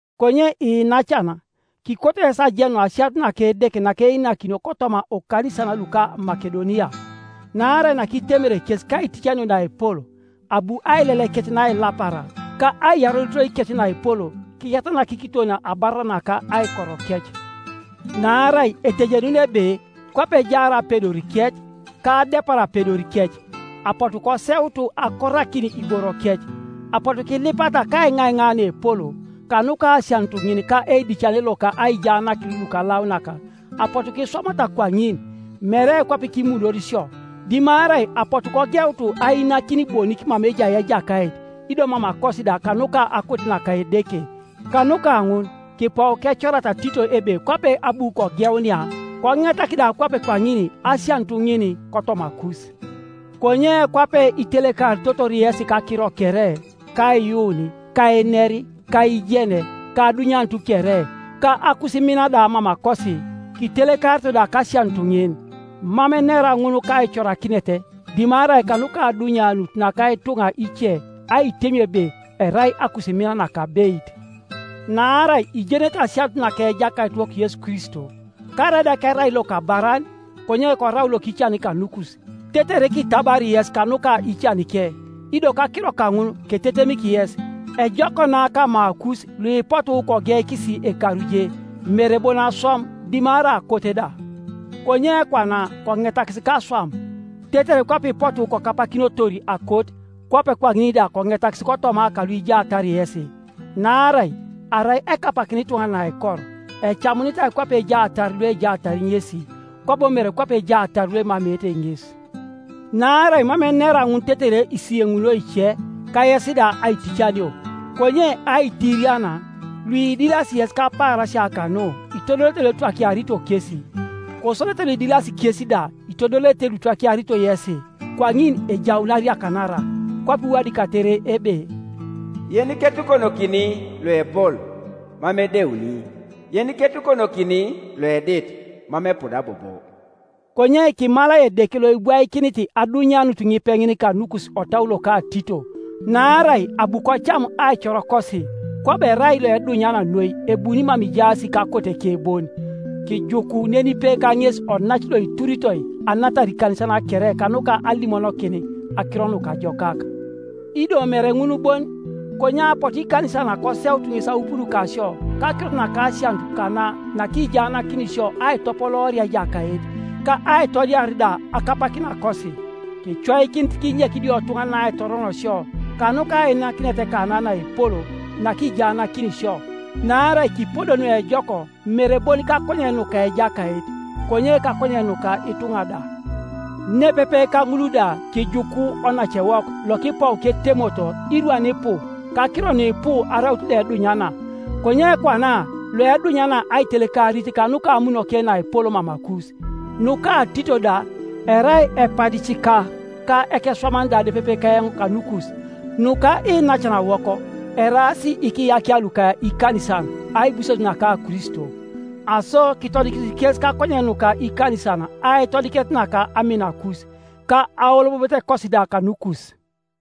Konye iinacan, kikoto yes ajenun asianut naka Edeke nakeinakinio kotoma okanisan luko Makedonia. Naarai nakitemere kes kaiticanio naepol, abu ailelekec nailapara, ka aiyarorotoikec naepol kiyatanak kiton abarara naka aikorokec. Naarai etejenun ebe kwape ejaar apedorikec, ka adepar apedorikec, apotu koseut akorakin iborokec. Apotu kilipata kaiŋaiŋa naepol, kanuka asianut ŋin ka eidicane loka ajiaanakin lukalaunak. Apotu kiswamata kwaŋin, mere kwape kimunor isio, dimarai apotu kogeut ainakin bonik mama ejai Ejakait, ido mamakosi da kanuka akote naka Edeke. Kanuka ŋun kipou kecorata Tito ebe kwape abu kogeunia, koŋetak da kwape kwaŋin asianut ŋin kotomakus. Konye kwape itelekaritotor yesi kakiro kere, kaiyuun, ka einer, ka aijen, ka adunyanut kere, ka akusimina da mamakosi, kitelekarito da kasianut ŋin. Mam enera ŋun kaicorakinet, dimarai kanuka adunyanut naka ituŋa ice aitemio ebe erai akusimin nakabeit. Naarai ijenete asianut naka Ejakaitiwok Yesu Kristo, karaida kerai lokabaran, konye korau lokican kanukus, tetere kitabari yes kanu ka icanike. Ido kakiro kaŋun ketetemik yes; ejok na kamakus luipotu kogeikis ekaru je, mere bon aswam, dimarai akot da, konye kwana koŋetakis kaswam, tetere kwape ipotu kokapakinotor akot, kwape kwaŋin da koŋetakis kotoma kaluijaatar yesi. Naarai arai ekapakina ituŋanan aikor, ecamunitai kwape ejaatar luejaatar ŋesi, kwabo mere kwape ejaatar luemameete ŋes, Naarai mam enera ŋun tetere isiyeŋunio ice, ka yes da aiticanio, konye aitirian, luidilasi yes kapaarasia kanu itodolete luetwakiarito kesi, kosodete luidilasi kes da itodolete luitwakiarito yesi, kwaŋin ejaun ariakanara. Kwape iwadikatere ebe, “Yeniketukonokini loepol mam edeuni, yeniketukonokini loedit, mam epuda bobo.” Konye kimalai Edeke loibwaikinit adunyanut ŋipeŋin kanukus otau loka Tito. Naarai abu kocam aicorokosi, kwabo erai loedunyana noi ebuni mama ijaas kakoteke bon. Kijuku nenipe kaŋes onac loituritoi anatar ikanisan kere kanuka alimonokin Akiro Nukajokak, ido mere ŋun bon, konye apotu ikanisan koseutu ŋes aupun kasio kakirot naka asianut kana nakijaanakini isio aitopolooria Ejakait, ka aitodiar da akapakinakosi, Kicoikinit kinyek idiotuŋanan aitoron sio kanuka ainakinet kana naepol nakijaanakini isio, naarai kipodo nuejok mere bon kakonyen nuka Ejakait, konye kakonyen nuka ituŋa da. Nepepe ka ŋul da kijuku onacewok lokipou ketemoto irwan ipu kakiro nuipu araut loedunyana, konye kwana loedunyana aitelekarit kanuka amunoke naepol mamakus. Nuka Tito da, erai epadicika ka ekeswaman da nepepe keoŋ kanukus; nuka iinacanawok, eraas ikiyakia luka ikanisan, aibuses naka Kristo. Aso kitodikisi kes kakonyen nuka ikanisan aitodikinet naka aminakus, ka aolobobotekosi da kanukus.